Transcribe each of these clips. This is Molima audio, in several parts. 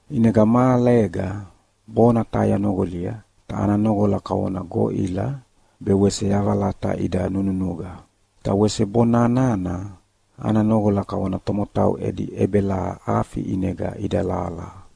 ʼInega mahalega bona taha yanoqolia, ta ana noqola kavona goʼila be wese yavalata ida nununuqa. Ta wese bona nana ana noqola kavona tomotau edi ʼebelaha afi ʼinega idalahalaha.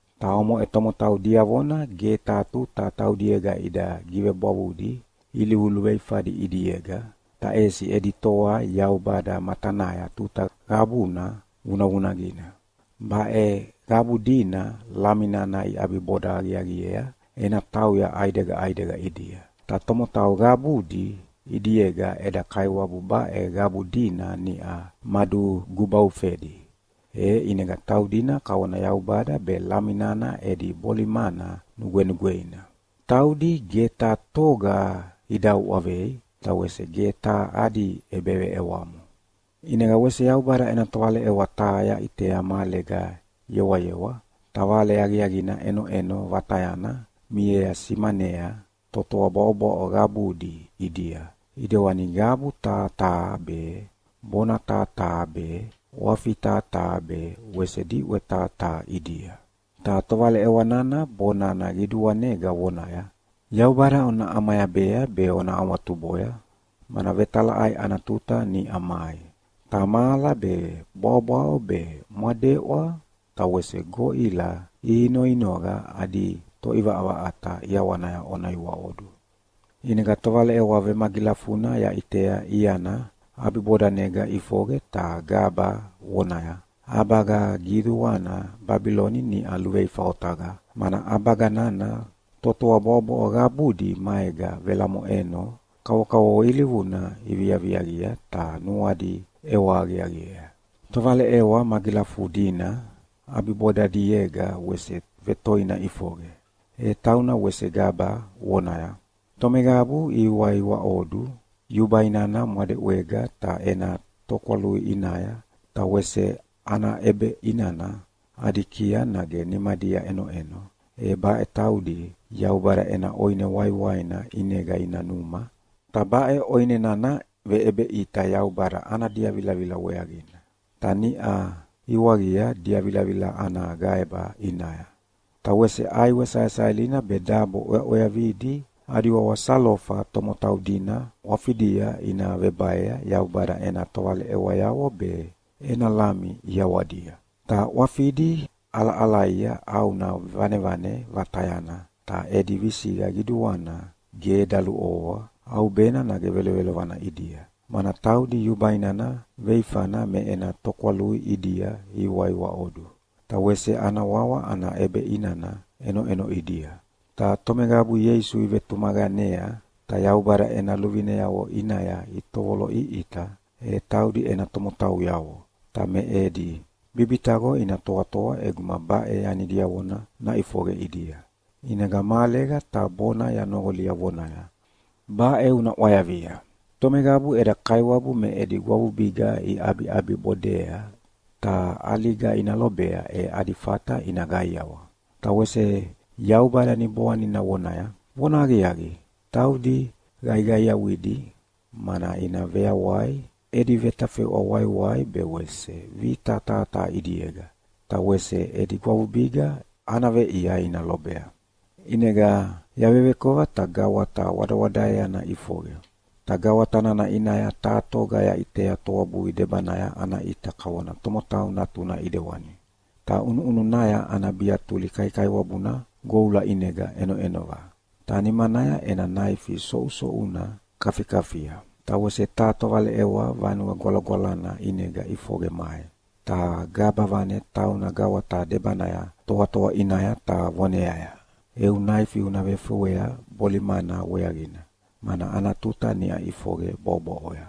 Ta omoʼe tomotau diavona ge taha tuta taudiega ida givebwavudi ilivu luveifadi ʼidiega, ta ʼesi edi toa Yaubada matanaya tuta qabuna vunavunaqina. Baʼe qabu dina Lami nana iʼabiboda aqiaqiea ena tauya ʼaidega ʼaidega ʼidia. Ta tomotau qabudi ʼidiega eda Kaiwabu baʼe qabu dina niʼa madugubaufedi, e ʼinega taudina kavona Yaubada be Lami nana edi bolimana nugwenugweina. Taudi ge taha toga ida uʼavei, ta wese ge taha adi ʼebeveʼewamo. ʼInega wese Yaubada ena tovaleʼewa taha yaʼitea mahalega yewayewa, ta Vale Aqiaqina ʼenoʼeno vatayana miea simanea totoa bwaʼobwaʼo qabudi ʼidia, ʼidewani qabu taha taha be, bona taha taha be, ʼwafi taha taha be, wese diʼwe taha taha ʼidia. Ta tovaleʼewa nana bonana qiduanega vonaya, “Yaubada ona ʼamayabea be ona awatuboya, mana vetalaʼai ana tuta niʼa mai. Ta mahala be, bwaʼobwaʼo be, mwadeʼwa ta wese goʼila ihinoinoqa adi Toʼivaʼavaʼata ʼiawanaya ona iwaʼodu.” ʼInega tovaleʼewa vemagilafuna yaʼitea iana ʼabibodanega ʼifoqe ta gaba vonaya, “ʼAbaga qiduana Babiloni niʼa luveifa otaqa, mana ʼabaga nana totoa bwaʼobwaʼo qabudi maega velamoʼeno kavokavovo ilivuna iviaviaqia ta nuadi ʼewa aqiaqiea.” Tovaleʼewa magilafudina ʼabibodadiega wese vetoina ʼifoqe, e tauna wese gaba vonaya, “Tomeqabu ihiwaiwaʼodu yubai nana mwadeʼwega ta ena tokwalui ʼinaya, ta wese ana ʼebeʼinana adi kiaya nage nimadia ʼenoʼeno, e baʼe taudi Yaubada ena ʼoine waiwaina ʼinega ina numa, ta baʼe ʼoine nana veʼebeʼita Yaubada ana diavilavila weaqina, ta niʼa iwaqia diavilavila ana gaeba ʼinaya. Ta wese ʼaiwe saesaelina be dabo ʼweaʼweavidi adi wawa salofa tomotau dina ʼwafidia ina vebaea Yaubada ena tovaleʼewayavo be ena Lami ʼiawadia. Ta ʼwafidi ʼalaʼalaia ʼauna vanevane vatayana, ta edi visiqa qiduana ge daluʼovoa ʼaubena nage velovelovana ʼidia, mana taudi yubai nana veifana me ena tokwalui ʼidia ihiwaiwaʼodu, ta wese ana wawa ana ʼebeʼinana ʼenoʼeno ʼidia. Ta tomeqabu Ieisu ivetumaqanea ta Yaubada ena luvineavo ʼinaya itovoloʼiʼita, e taudi ena tomotauyavo, ta me edi bibitaqo ina toatoa ʼeguma baʼe yani diavona naʼifoqe ʼidia.” ʼInega mahalega taha bona yanoqolia vonaya, “Baʼe una ʼwayavia: Tomeqabu eda Kaiwabu me edi gwavubiga iʼabiʼabibodea ta ʼaliga ina lobea, e adi fata ina qaiawa.” Ta wese Yaubada Niboanina vonaya, “Vonahaqiaqi, taudi qaiqaiawidi, mana ina veyawai edi vetafeʼwa waiwai be wese vita taha taha ʼidiega, ta wese edi gwavubiga ana veʼia ina lobea.” ʼInega yavevekova ta gawata wadawadaeana ʼifoqe. Ta gawata nana ʼinaya taha toga yaʼitea toabui debanaya ana ʼita kavona tomotau natuna ʼidewani. Ta ʼunuʼununaya ana biatuli kaikaiwabuna goula ʼinega ʼenoʼenova, ta nimanaya ena naifi soʼusoʼuna kafikafia. Ta wese taha tovaleʼewa Vanue Gwalagwalana ʼinega ʼifoqe mai, ta gaba vane tauna gawata debanaya toatoa ʼinaya ta voneaya, “Eu naifi una vefewea bolimana weaqina, mana ana tuta niʼa ʼifoqe bwaʼobwaʼoya!”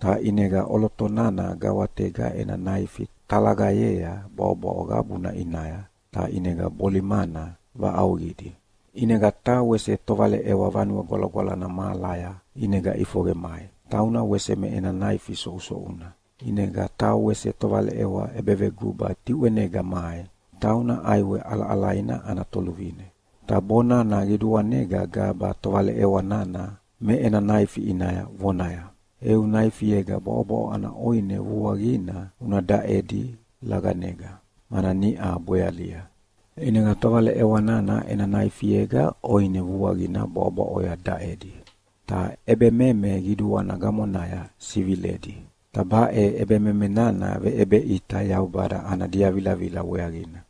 Ta ʼinega ʼoloto nana gawatega ena naifi talaqayea bwaʼobwaʼo qabuna ʼinaya, ta ʼinega bolimana vaʼauqidi. ʼInega taha wese tovaleʼewa Vanue Gwalagwalana mahalaya ʼinega ʼifoqe mai, tauna wese me ena naifi soʼusoʼuna. ʼInega taha wese tovaleʼewa ʼebeveguba diʼwenega mai, tauna ʼaiwe ʼalaʼalaina ana toluvine. Ta bonana qiduanega gaba tovaleʼewa nana me ena naifi ʼinaya, vonaya, “Eu naifiega bwaʼobwaʼo ana ʼoine vuaqina una daʼedi laqanega, mana niʼa bwealia.” ʼInega tovaleʼewa nana ena naifiega ʼoine vuaqina bwaʼobwaʼoya daʼedi, ta ʼebememe qiduana gamonaya siviledi. Ta baʼe ʼebememe nana veʼebeʼita Yaubada ana diavilavila weaqina.